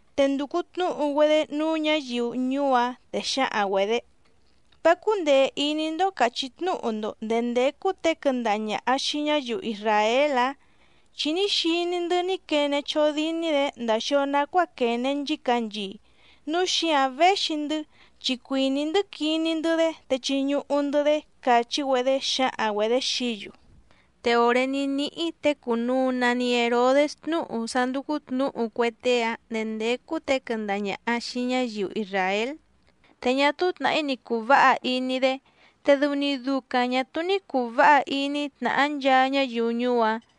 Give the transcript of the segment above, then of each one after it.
Te ndùcu tnúhu‑güedé núú ñǎyiu ñuú‑áⁿ, te xǎhaⁿ‑güedě: —¿Vá cúndèe iní‑ndó càchí tnúhu‑ndo ndèé ndécú těe quɨndaha ñàha xii ñáyiu isràél‑ǎⁿ? Chi ní xiní‑ndɨ́ ní quene chódíní‑dě ndàa xio nacuáa quène nchícanchii, núu xíǎⁿ véxi‑ndɨ́ chi cuìní‑ndɨ́ quiní‑ndɨ́‑dé te chiñuhu‑ndɨ̌‑dé —càchí‑güedé xǎhaⁿ‑güedě xií‑yu. Te òré ní níhí těe cùnuu nani Herodés tnúhu sá ndúcú tnǔhu cue tée‑áⁿ ndèé ndécú těe quɨndaha ñàha xii ñáyiu isràél, te ñá túú tnàhí ni cùu váha iní‑dé, te dɨu‑ni ducaⁿ ñà túú ní cùu váha iní tnàhá nchaa ñáyiu ñuú‑áⁿ.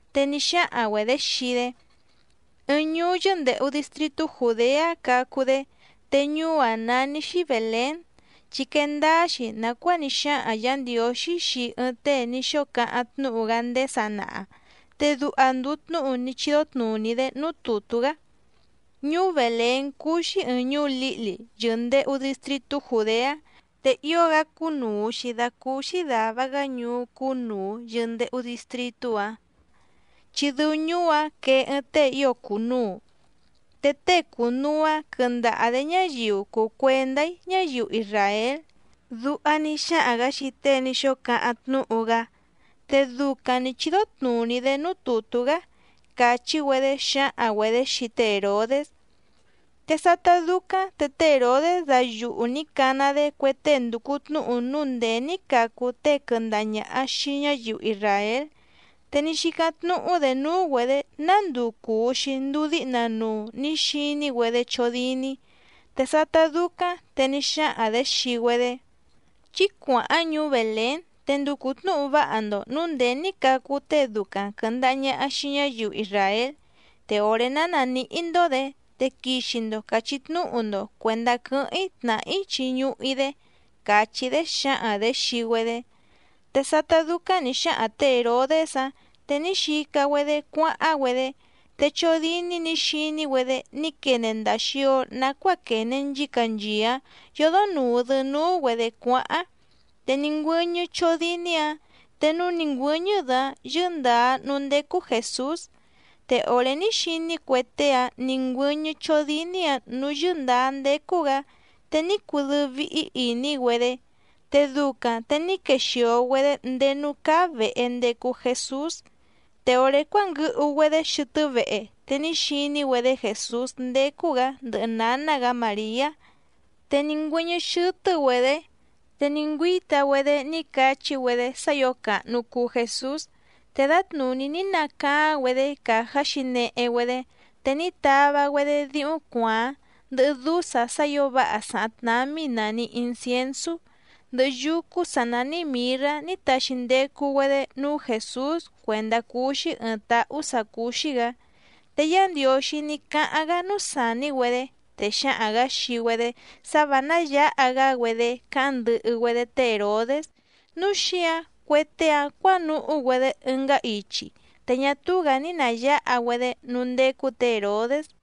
Te ní xáhaⁿ‑güedě xii‑dé: —Ɨɨⁿ ñuú yɨ́ndèhu distritú Jùdeá cacu‑dé, te ñuú‑áⁿ nání‑xí Bèlén, chi quee ndáá‑xi nàcuáa ní xáhaⁿ Yǎ Ndiǒxí xii ɨɨⁿ tée ní xóo cáháⁿ tnúhu‑gá ndéé sanaha. Te duha ndùu tnúhu ní chídó tnùní‑dé núú tùtú‑gá: Ñuú Bèlén cúú‑xí ɨ̀ɨⁿ ñuú lǐhli yɨ̀ndehu distritú Jùdeá, te ío‑gá cúnùu‑xi dacúúxí dàva‑gá ñuú cúnùu yɨndehu distritú‑áⁿ, chi dɨu ñuú‑áⁿ quee ɨɨⁿ tée ío cùnuu. Te tée cunuu‑ǎⁿ quɨndaha‑dě ñáyiu cùu cuendá‑í ñáyiu isràél. Duha ní xáhaⁿ‑gǎ xii tée ní xóo cáháⁿ tnúhu‑gá, te ducaⁿ nǐ chídó tnùní‑dé núú tùtú‑gá —càchí‑güedé xǎhaⁿ‑güedě xii té Hèrodés. Te sátá dúcáⁿ te té Hèrodés dayuhu nǐ cana‑dé cue tée ndùcu tnúhu núu ndèé ní cacu tée quɨndaha ñàha xii ñáyiu isràél, te ní xícáⁿ tnúhú‑dě núú‑güedě ná nduu cùu‑xi nduu díhna nuu nǐ xiní‑güedé chódíní. Te sátá dúcáⁿ te ní xáhaⁿ‑dě xii‑güedé: —Chí cuàháⁿ ñuú Bèlén te nducu tnǔhu váha‑ndo nǔu ndèé ní cacu tée ducaⁿ quɨ̀ndaha ñaha xii ñáyiu isràél. Te òré ná nàníhí‑ndó‑dě te quixi‑ndo càchí tnúhu‑ndo cuèndá quɨ́hɨ́ⁿ‑í tnàhá‑í chiñuhu‑í‑dé —càchí‑dé xǎhaⁿ‑dě xii‑güedé. Te sátá dúcáⁿ nǐ xáhaⁿ tě Hèrodés‑áⁿ te ní xica‑güedé cuáháⁿ‑güedé. Te chódíní nǐ xiní‑güedé ní quene ndàa xio nacuáa quène nchícanchii‑áⁿ yòdo nuu‑dɨ núú‑güedě cuáháⁿ. Te ní ngüɨ́ñɨ́ chódíní‑ǎⁿ, te núú nǐ ngüɨ́ñɨ́‑dɨ‑áⁿ yɨ́ndǎá núú ndécú Jèsús. Te òré ní xiní cue tée‑áⁿ nǐ ngüɨ́ñɨ́ chódíní‑ǎⁿ nǔú yɨ́ndǎá ndécú‑gǎ, te ní cudɨ́ɨ́ víhí ìní‑güedé. Te ducaⁿ te ní quexìo‑güedé ndéé núú cáá vèhe ndecu Jesús. Te òré cuánguɨhu‑güedé xɨtɨ́ vehe te ní xiní‑güedé Jèsús ndécú‑gǎ ndɨhɨ nǎná‑gǎ Màriá. Te ní ngüɨ́ñɨ́ xɨ́tɨ́‑güedě, te ní ngüíta‑güedé ní cachí‑güedé sá ǐo càhnu cuu Jesús. Te dǎtnùní ní nacaáⁿ‑güedé càjá xǐnehe‑güedé, te ní tava‑güedé díhúⁿ cuàáⁿ, ndɨhɨ dúsa sá ǐo váha sàháⁿ tnámí nàni insiensú, ndɨhɨ yúcú sǎ nání mìrrá ní taxi ndecu‑güedé núú Jèsús cuèndá cuu‑xi ɨɨⁿ táhú sǎ cúú‑xí‑gǎ. Te Yá Ndiǒxí ní cáháⁿ‑gá núú sàní‑güedé, te xǎhaⁿ‑gǎ xii‑güedé sá vǎ náyǎha‑gá‑güedé cáháⁿ ndɨhɨ‑güedé té Hèrodés. Núu xíǎⁿ cue tée‑áⁿ cuǎnuhú‑güedé ɨngá ichi, te ñá túú‑gǎ ní nàyáha‑güedé núú ndécú tě Hèrodés.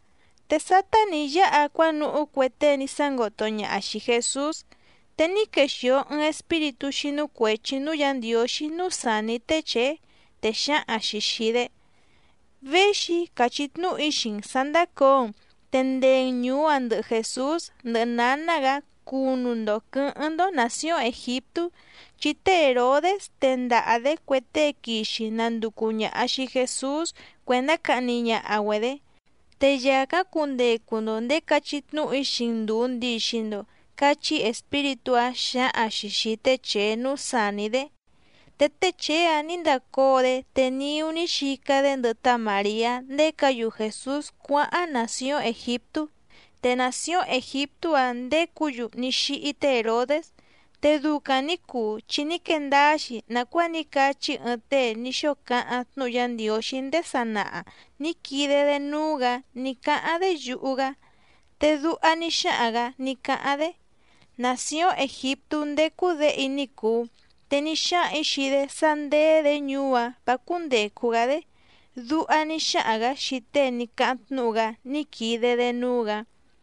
Te sátá nǐ yáha cuánuhú cue tée ní sángoto ñaha xìi Jesús, te ní quexìo ɨɨⁿ espíritú xínú cuèchi núú Yǎ Ndiǒxí núú sàní té Chèé, te xǎhaⁿ‑xi xìi‑dé: —Véxi‑í càchí tnúhu‑í xii‑n sǎ ndàcóo‑n, te ndee‑n ñùú‑a ndɨhɨ Jèsús, ndɨhɨ nǎná‑gǎ cunu‑ndo quɨ̌hɨ́ⁿ‑ndó nàcióⁿ Ègiptú, chi té Hèrodés tendaha‑dě cue tée quixi nanducu ñàha xii Jesús cuèndá cahni ñaha‑güedě. Te yàcáⁿ cundecu‑ndo nděé cachí tnúhu‑í xii‑n ndùu ndixi‑ndo —cachí espíritú‑áⁿ xǎhaⁿ‑xi xìi té Chèé núú sàní‑dé. Te té Chèé‑áⁿ nǐ ndacóo‑dé, te niú ní xica‑dé ndɨhɨ tá Màriá ndécǎ‑yu Jèsús cuáháⁿ nàcióⁿ Ègiptú. Te nàcióⁿ Ègiptú‑áⁿ ndécǔ‑yu ní xíhí té Hèrodés. Te ducaⁿ nǐ cuu chi ní quee ndáá‑xi nàcuáa ní cachí ɨɨⁿ tée ní xóo cáháⁿ tnúhu Yá Ndiǒxí ndéé sanaha nǐ quide‑dé núú‑gǎ ní cáháⁿ‑dé yuhu‑gá, te duha ní xáhaⁿ‑gǎ ní cáháⁿ‑dé: “Nàcióⁿ Ègiptú ndécú Děhe‑í ní cùu, te ní xáhaⁿ‑ǐ xii‑dé sá ndéé‑dě ñuú‑áⁿ vǎ cúndècu‑gá‑dé”, duha ní xáhaⁿ‑gǎ xii tée ní cáháⁿ tnúhu‑gá ní quide‑dé núú‑gǎ.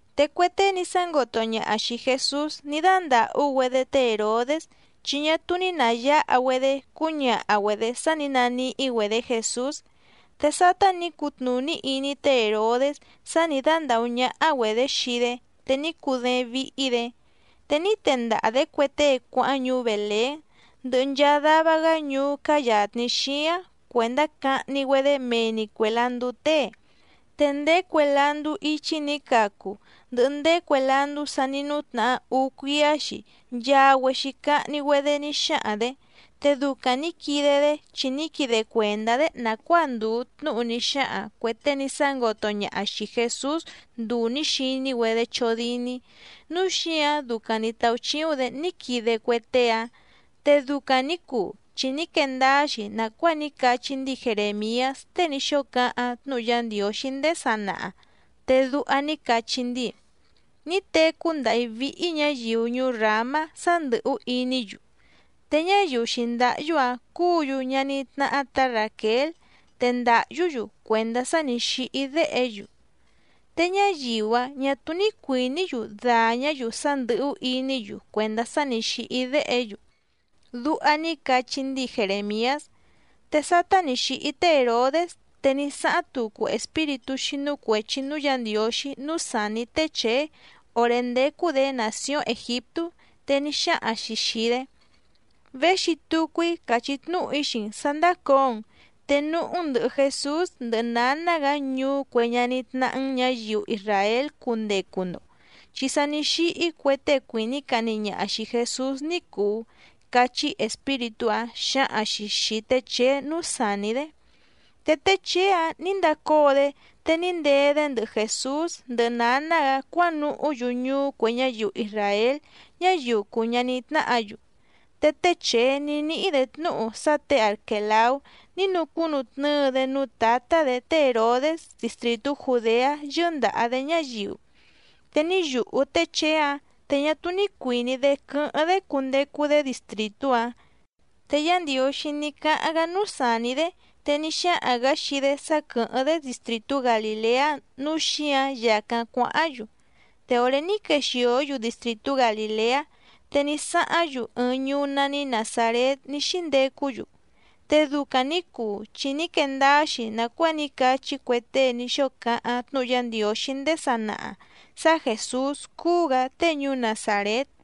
Te cue tée ní sángoto ñaha xìi Jesús ní dándàhú‑güedé té Hèrodés, chi ñá túú ní nàyáha‑güedé cúñaha‑güedě sá nǐ naníhí‑güedě Jèsús. Te sátá nǐ cutnùní iní té Hèrodés sá nǐ dándàhú ñáhá‑güedě xii‑dé te ní cudééⁿ víhí‑dě, te ní tendaha‑dě cue tée cuáháⁿ ñuú Bèlén, ndɨhɨ nchaa dava‑gá ñuú cáá yàtni xíáⁿ cuèndá cahni‑güedé mee‑ni cuè landú tée. Te ndéé cue landú íchí nǐ cacu, ndɨhɨ ndéé cue landú sa ní nútnahá úú cuíá‑xi nchaa‑güexi cahni‑güedé ní xáhaⁿ‑dě. Te ducaⁿ nǐ quide‑dé chi ní quide cuèndá‑dé nàcuáa ndùu tnúhu ní xáhaⁿ cuè tée ní sángoto ñaha xìi Jesús nduu nǐ xiní‑güedé chódíní, núu xíǎⁿ ducaⁿ nǐ táúchíúⁿ‑dě ní quide cue tée‑áⁿ. Te ducaⁿ nǐ cuu chi ní quee ndáá‑xi nàcuáa ní cachí ndíi Jerèmiás tée ní xóo cáháⁿ tnúhu Yá Ndiǒxí ndéé sanaha, te duha ní cachí ndíi: Ní tecú ndàhí víhí ñǎyiu ñuú Ràmá sá ndɨ̀hú iní‑yu, te ñáyiu xǐndáhyú‑áⁿ cúǔ‑yu ñaní tnáhá tǎ Ràquél, te ndàhyú‑yu cuèndá sá nǐ xíhí déhe‑yu. Te ñáyiu‑áⁿ ñà túú ní cuìní‑yu dàñá‑yu sá ndɨ̀hú iní‑yu cuèndá sá nǐ xíhí déhe‑yu. Duha ní cachí ndíi Jerèmiás. Te sátá nǐ xíhí té Hèrodés te ní sáháⁿ tucu espíritú xínú cuèchi núú Yǎ Ndiǒxí núú sàní té Chèé òré ndécú‑dě nàcióⁿ Ègiptú, te ní xáhaⁿ‑xi xìi‑dé: —Véxi tucu‑í càchí tnúhu‑í xii‑n sǎ ndácǒo‑n, te núhú‑n ndɨ̀hɨ Jesús ndɨhɨ nǎná‑gǎ ñuú cue ñaní tnáhá‑n ñǎyiu isràél cundecu‑ndo, chi sa ní xíhí cue tée cuìní cahni ñaha xìi Jesús ní cùu —cachí espíritú‑áⁿ xǎhaⁿ‑xi xìi té Chèé núú sàní‑dé. Te té Chèé‑áⁿ nǐ ndacóo‑dé, te ní ndee‑dé ndɨhɨ Jèsús ndɨhɨ nǎná‑gǎ cuánuhú‑yu ñuú cue ñáyiu isràél ñáyiu cùu ñaní tnáhǎ‑yu. Te té Chèé ní níhí‑dě tnúhu sá tě Arquèlaú ní nucúnutnɨ́ɨ‑dé núú tǎtá‑dě té Hèrodés distrìtú Jùdeá yɨ́ndàha‑dé ñáyiu. Te ní yùhú té Chèé‑áⁿ, te ñá túú ní cuìní‑dé quɨ́hɨ́ⁿ‑dé cundecu‑dé distrìtú‑áⁿ. Te Yá Ndiǒxí ní cáháⁿ‑gá núú sàní‑dé, te ní xáhaⁿ‑gǎ xii‑dé sá quɨ̀hɨ́ⁿ‑dé distrìtú Galìleá, núu xíǎⁿ yàcáⁿ cuáháⁿ‑yu. Te òré ní quexìó‑yu distrìtú Galìleá, te ní sáháⁿ‑yu ɨɨⁿ ñuú nání Nàzarét ní xíndecú‑yu. Te ducaⁿ nǐ cuu chi ní quee ndáá‑xi nàcuáa ní cachí cue tée ní xóo cáháⁿ tnúhu Yá Ndiǒxí ndéé sanaha sá Jèsús cuu‑gá tée ñuú Nazàrét.